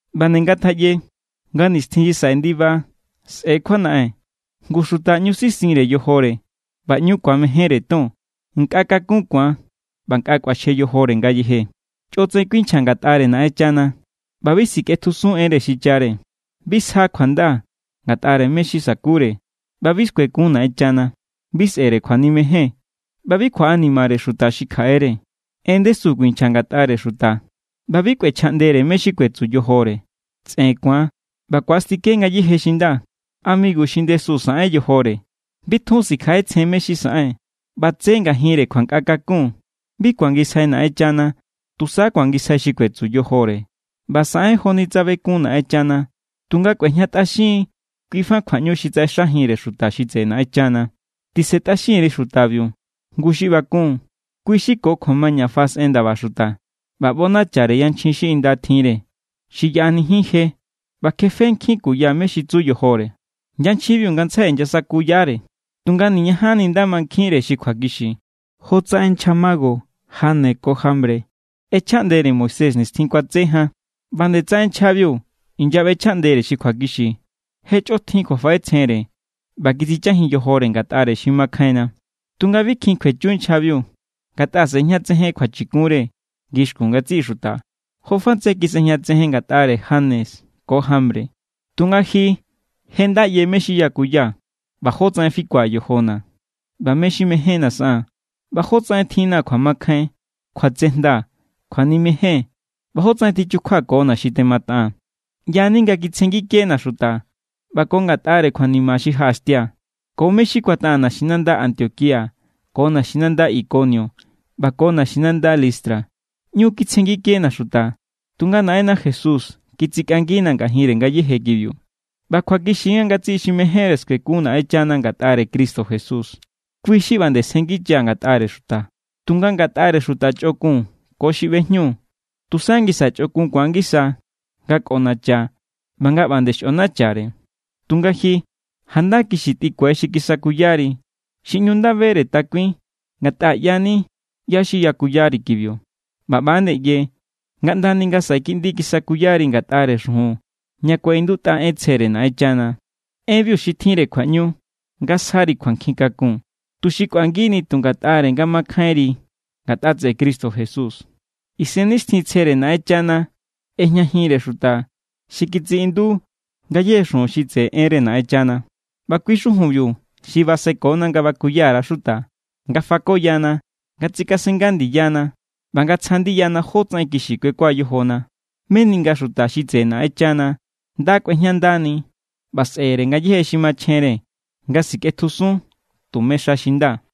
ꞌBa nde ngatjaꞌye nga nixtjin xi saꞌe ndiba sꞌe̱= kjuanaꞌen. Ngu xuta ꞌñu sisinre yojore ꞌba ꞌñu ku̱amejénre ton. Nkꞌa kakun ku̱an ꞌba nkꞌa kꞌuaxje yojore ngayeje. Chꞌotsaꞌen kuinchja ngatꞌare Naꞌenchana ꞌba bi sikꞌetjusun enre xichare. Bi sja kjuanda ngatꞌare mé= xi sa̱kure ꞌba bi skuekun Naꞌenchana. Bi sꞌe̱re kjuanimejen ꞌba bi kjuaꞌanimare xuta xi kjaꞌere. En ndesu kuinchja ngatꞌare xuta ꞌba bi kꞌuechjaꞌndere mé= xi kuetsu yojore. Tsꞌen ku̱an ꞌba ku̱astike ngayéje xi nda. Amigu xi ndesu saꞌen yojore, bi tjun sikjaꞌetsjen mé= xi saꞌen, ꞌba tse ngajinre kjuankꞌa kakun. Bi kuangisjai Naꞌenchana, tusa kuangisjai xi kuetsu yojore. ꞌBa saꞌen joni tsa bekun Naꞌenchana, tunga kꞌuejñatꞌaxin= kui fa kjuaꞌñu xi tsaꞌexajinre xuta xi tseꞌe Naꞌenchana. Tisentꞌaxin_ri xutabiu. Ngu xi ꞌba kun, kui xi ko kjuamaña faꞌasꞌen ndaba xuta ꞌba ꞌbonachare yanchjin xi inda tjinre, xi yaꞌanijin je ꞌba kjefe nkjin kuya mé= xi tsu yojore. Yanchjinbiu ngantsjai inyasakuyare, tunga niñajanni nda mankjinre xi kjuakixi. Jotsaꞌen nchja mago Janes ko Jambre ꞌechjaꞌndere Moisés nixtjin kuatse jan, ꞌba nde tsaꞌen nchjabiu inyaꞌbechjaꞌndere xi kjuakixi. Je chꞌotjin kjuafaꞌetsjenre ꞌba kitsichajin yojore ngatꞌare xi makjainna. Tunga bi kjin kjuechu nchjabiu, ngatꞌa sꞌe̱jñatsejen kjuachikunre ngixkun ngatsiꞌi xuta, jofa tsaꞌen kisꞌejñatsejen ngatꞌare Janes ko Jambre. Tunga ji je nda ꞌye mé= xi yakuya, ꞌba jótsaꞌen fikua̱ yojona̱, ꞌba mé= xi mejénna̱ saꞌaa̱n, ꞌba jótsaꞌen tjinna̱ kjuamakjain, kjuatsejnda, kjuanimejen, ꞌba jótsaꞌen tichukjuakona̱ xi temataꞌaa̱n. ꞌYa=ni nga kitsjengikena̱ xuta, ꞌba ko ngatꞌare kjuanima xi jaꞌaxtia̱, ko mé= xi kuataꞌaa̱n naxinanda Antioquía ko naxinanda Ikonio ꞌba ko naxinanda Listra. ꞌÑu kitsjengikena̱ xuta, tunga Naꞌenna Jesús kitsikꞌangina̱ ngajinre ngayéje kibiu. ꞌBa kjuakixi= nga ngatsiꞌi xi mejénre skuekun Naꞌenchana ngatꞌare Cristo Jesús, kui= xi ꞌba nde sjenngicha ngatꞌare xuta. Tunga ngatꞌare xuta chꞌokun ko xi ꞌbejñu, tusa ngisa chꞌokun ku̱an ngisa nga kꞌonacha ꞌba nga ꞌba nde xꞌonachare. Tunga ji, janda kixi tꞌikue xi kisakuyari, xi ꞌñu nda bere takuin, ngatꞌa ꞌyani ꞌyá= xi yakuyari kibiu. ꞌBa ꞌba=nde ꞌye nga ꞌndani nga saꞌe kiꞌndi kisakuyari ngatꞌare xujun ña kuaꞌindutꞌa en tsjere Naꞌenchana. Enbiu xi tjinre kjuaꞌñu nga sjari kjuankjin kakun, tuxi kꞌuangini tu ngatꞌare nga mankjainri ngatꞌa tseꞌe Cristo Jesús. Isennixtjintsjere Naꞌenchana ꞌejñajinre xuta xi kitsiꞌindu ngayéje xujun xi tseꞌe enre Naꞌenchana, ꞌba kui= xujunbiu xi basekona nga bakuya_ra xuta, nga fakoyana, nga tsikasenga ndiyana, ꞌba nga tsja ndiyana jótsaꞌen kixi kuekua yojona, meni nga xuta xi tseꞌe Naꞌenchana nda kꞌuejñandani ꞌba sꞌe̱re ngayéje xi machjenre nga sikꞌetjusun tume xa xi nda.